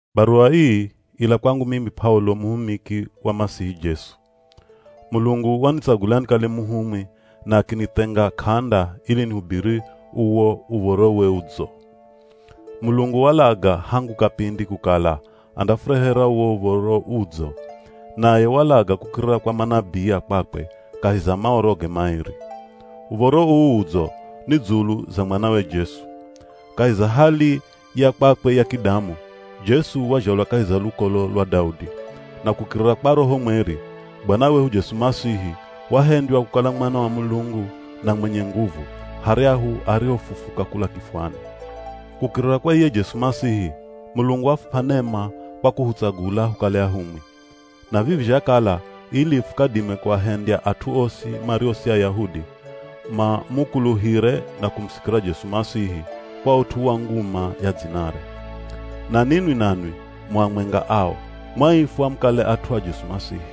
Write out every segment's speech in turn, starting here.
Baruwa ii ila kwangu mimi P'aulo muhumiki wa Masihi Jesu. Mulungu wanitsagula nikale muhumwi na akinithenga k'anda ili nihubiri uwo Uv̱orowe Udzo. Mulungu walaga hangu kapindi kukala andafurehera uwo Uv̱oro Udzo. Naye walaga kukirira kwa manabii a kwakwe, kahi za Maoroge maeri. Uv̱oro uu Udzo ni dzulu za mwanawe Jesu. Kahi za hali ya kwakwe ya kidamu, Jesu wazhalwa kahi za lukolo lwa Daudi. Na kukirira kwa Roho Mweri, Bwana wehu Jesu Masihi, wahendywa kukala Mwana wa Mulungu na mwenye nguvu, haryahu arihofufuka kula kifwani. Kukirira kwa iye Jesu Masihi, Mulungu wafup'a nema kwa kuhutsagula hukale ahumwi. Na vivi zhakala ili fukadime kuahendya at'u osi mario si Ayahudi, mamukuluhire na kumusikira Jesu Masihi, kwa ut'u wa nguma ya dzinare. Na ninwi nanwi mu amwenga ao, mwaifwa mukale at'u a Jesu Masihi.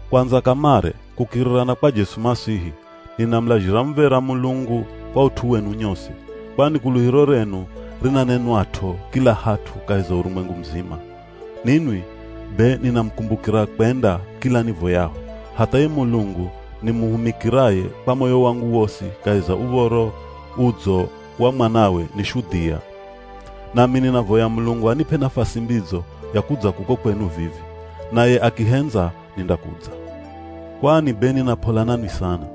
Kwandza kamare, kukirira na kwa Jesu Masihi, ninamulazhira muv̱era Mulungu kwa ut'u wenu nyosi, kwani kuluhiro renu rinanenwat'o kila hat'u kahi za urumwengu muzima. Ninwi be ninamukumbukira kwenda kila nivoyaho, hatha ye Mulungu nimuhumikiraye kwa moyo wangu wosi kahi za Uv̱oro Udzo wa mwanawe ni shudhia. Nami ninavoya Mulungu anip'e nafasi mbidzo ya kudza kuko kwenu vivi. Naye akihendza nindakudza. Kwani be nina p'ola nanwi sana.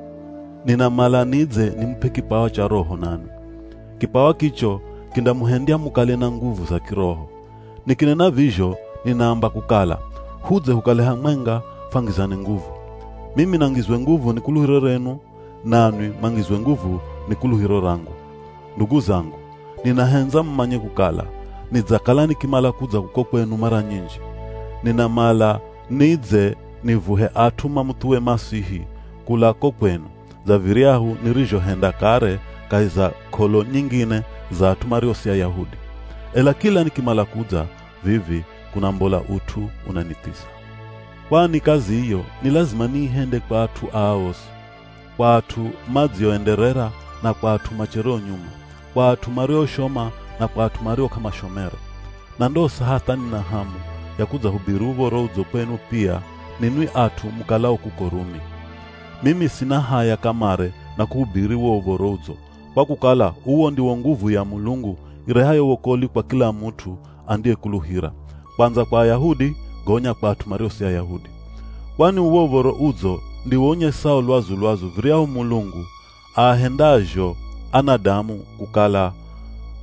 Ninamala nidze nimup'e kipawa cha roho nanwi. Kipawa kicho kindamuhendya mukale na nguvu za kiroho. Nikinena vizho ninaamba kukala, hudze hukale hamwenga fwangizane nguvu. Mimi nangizwe nguvu ni kuluhiro renu, nanwi mwangizwe nguvu ni kuluhiro rangu. Ndugu zangu, ninahendza mumanye kukala, nidzakala nikimala kudza kuko kwenu mara nyinji. Ninamala nidze nivuhe at'u mamuthuwe Masihi kula ko kwenu, dza viryahu nirizhohenda kare kahi za k'olo nyingine za at'u mario si Ayahudi. Ela kila nikimala kudza vivi kunambola ut'u unanithiza. Kwani kazi iyo ni lazima niihende kwa at'u aa osi; kwa at'u madzioenderera na kwa at'u machereo nyuma, kwa at'u marioshoma na kwa at'u mario k'amashomere. Na ndosa hatha nina hamu ya kudzahubiri Uv̱oro Udzo kwenu pia ninwi at'u mukalao kuko Rumi. Mimi sina haya kamare na kuhubiri wo Uv̱oro Udzo, kwa kukala uwo ndiwo nguvu ya Mulungu irehayo wokolwi kwa kila mut'u andiyekuluhira; kwandza kwa Ayahudi, gonya kwa at'u mario si Ayahudi. Kwani uwo Uv̱oro Udzo ndiwo unyesao lwazu-lwazu viryahu Mulungu aahendazho anadamu kukala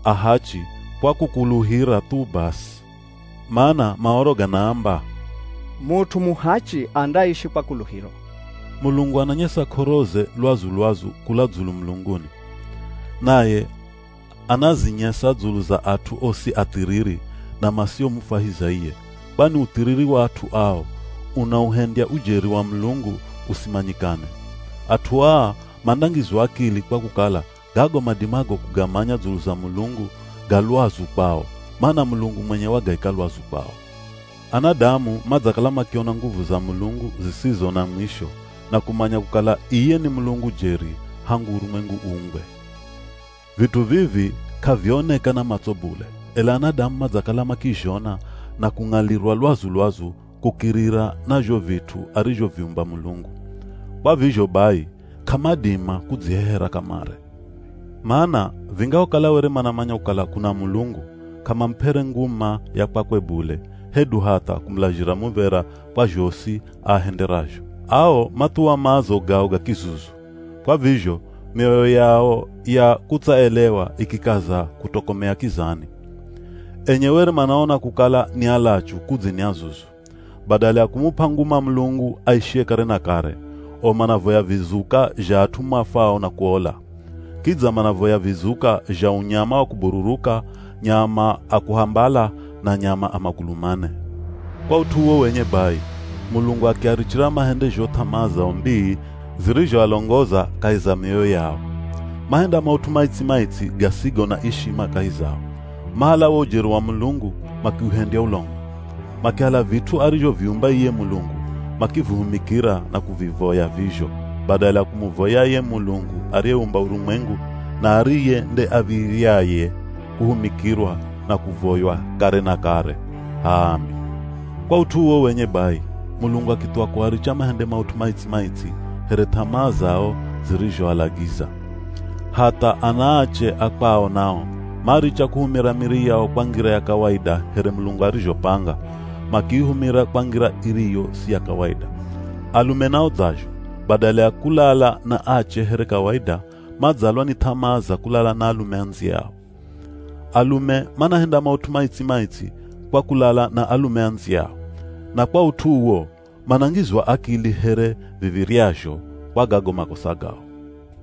ahachi kwa kukuluhira thu basi. Mana Maoro ganaamba, “Mut'u muhachi andaishi kwa kuluhiro.” Mulungu ananyesa k'oroze lwazu-lwazu kula dzulu mulunguni. Naye anazinyesa dzulu za at'u osi athiriri na masiomufwahiza iye, kwani uthiriri wa at'u ao unauhendya ujeri wa Mulungu usimanyikane. At'u aa mandangizwa akili kwa kukala gago madimago kugamanya dzulu za Mulungu ga lwazu kwao, mana Mulungu mwenye wagaika lwazu kwao. Anadamu madzakala makiona nguvu za Mulungu zisizo na mwisho na kumanya kukala iye ni Mulungu jeri hangu urumwengu uumbwe. Vit'u vivi k'avioneka na matso bule, ela anadamu madzakala makizhona na kung'alirwa lwazu-lwazu kukirira na zho vit'u arizhoviumba Mulungu. Kwa vizho bai, k'amadima kudzihehera kamare. Mana vingahokala were manamanya kukala kuna Mulungu, k'amamup'ere nguma ya kwakwe bule hedu hatha kumulazhira muv̱era kwa zhosi aahenderazho. Ao mathuwa maazo gao ga kizuzu. Kwa vizho, mioyo yao ya kutsaelewa ikikaza kutokomea kizani. Enye were manaona kukala ni alachu kudzi ni azuzu. Badala ya kumup'a nguma Mulungu aishiye kare na kare, o manavoya vizuka zha at'u mafwao na kuola. Kidza manavoya vizuka zha unyama wa kubururuka, nyama a kuhambala, na nyama a magulu mane. Kwa ut'u uwo wenye bai, Mulungu akiarichira mahende zho th'amaa zao mbii zirizhoalongoza kahi za mioyo yao. Mahenda maut'u maitsi-maitsi gasigo na ishima kahi zao. Mahala wo ujeri wa Mulungu makiuhendya ulongo. Makihala vit'u arizhoviumba iye Mulungu makivihumikira na kuvivoya vizho, badala ya kumuvoya ye Mulungu ariyeumba urumwengu, na ariye nde av̱iryaye kuhumikirwa na kuvoywa kare na kare. H'aami! Kwa ut'u uwo wenye bai, Mulungu akithuwa kuaricha mahende maut'u maitsi-maitsi here th'amaa zao zirizhoalagiza. Hatha anaache a kwao nao maricha kuhumira miri yao kwa ngira ya kawaida here Mulungu arizhopanga, makiihumira kwa ngira iriyo si ya kawaida. Alume nao dzazho, badala ya kulala na ache here kawaida, madzalwa ni th'amaa za kulala na alume andziyao. Alume manahenda maut'u maitsi-maitsi kwa kulala na alume andziyao. Na kwa ut'u uwo, manangizwa akili here viv̱iryazho kwa gago makosa gao.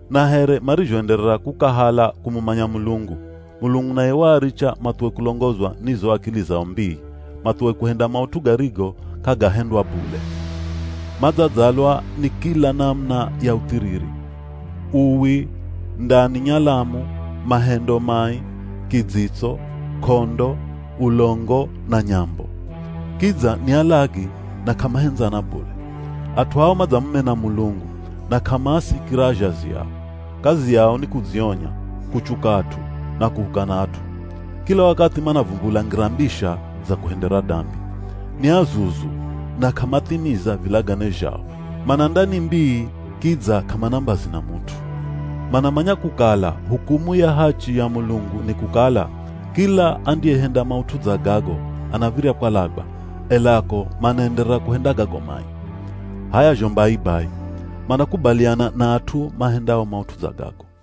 Na here marizhoenderera kukahala kumumanya Mulungu, Mulungu naye waaricha mathuwe kulongozwa ni zo akili zao mbii, mathuwe kuhenda maut'u garigo k'agahendwa bule. Madzadzalwa ni kila namuna ya uthiriri: Uwi, ndani nyalamu, mahendo mai, kidzitso, k'ondo, ulongo, na nyambo. Kidza ni alagi na k'amahendzana bule. At'u ao madzamumena Mulungu, na k'amaasikira azhazi ao. Kazi yao ni kudzionya, kuchuka at'u, na kuhukana at'u. Kila wakathi manavumbula ngira mbisha za kuhendera dambi. Ni azuzu, na k'amathimiza vilagane zhao. Mana ndani mbii kidza k'amana mbazi na mut'u. Manamanya kukala hukumu ya hachi ya Mulungu ni kukala, kila andiyehenda maut'u dza gago anav̱irya kwalagwa, ela ko manaenderera kuhenda gago mai. H'aya zho mbai bai, manakubaliana na at'u mahendao maut'u dza gago.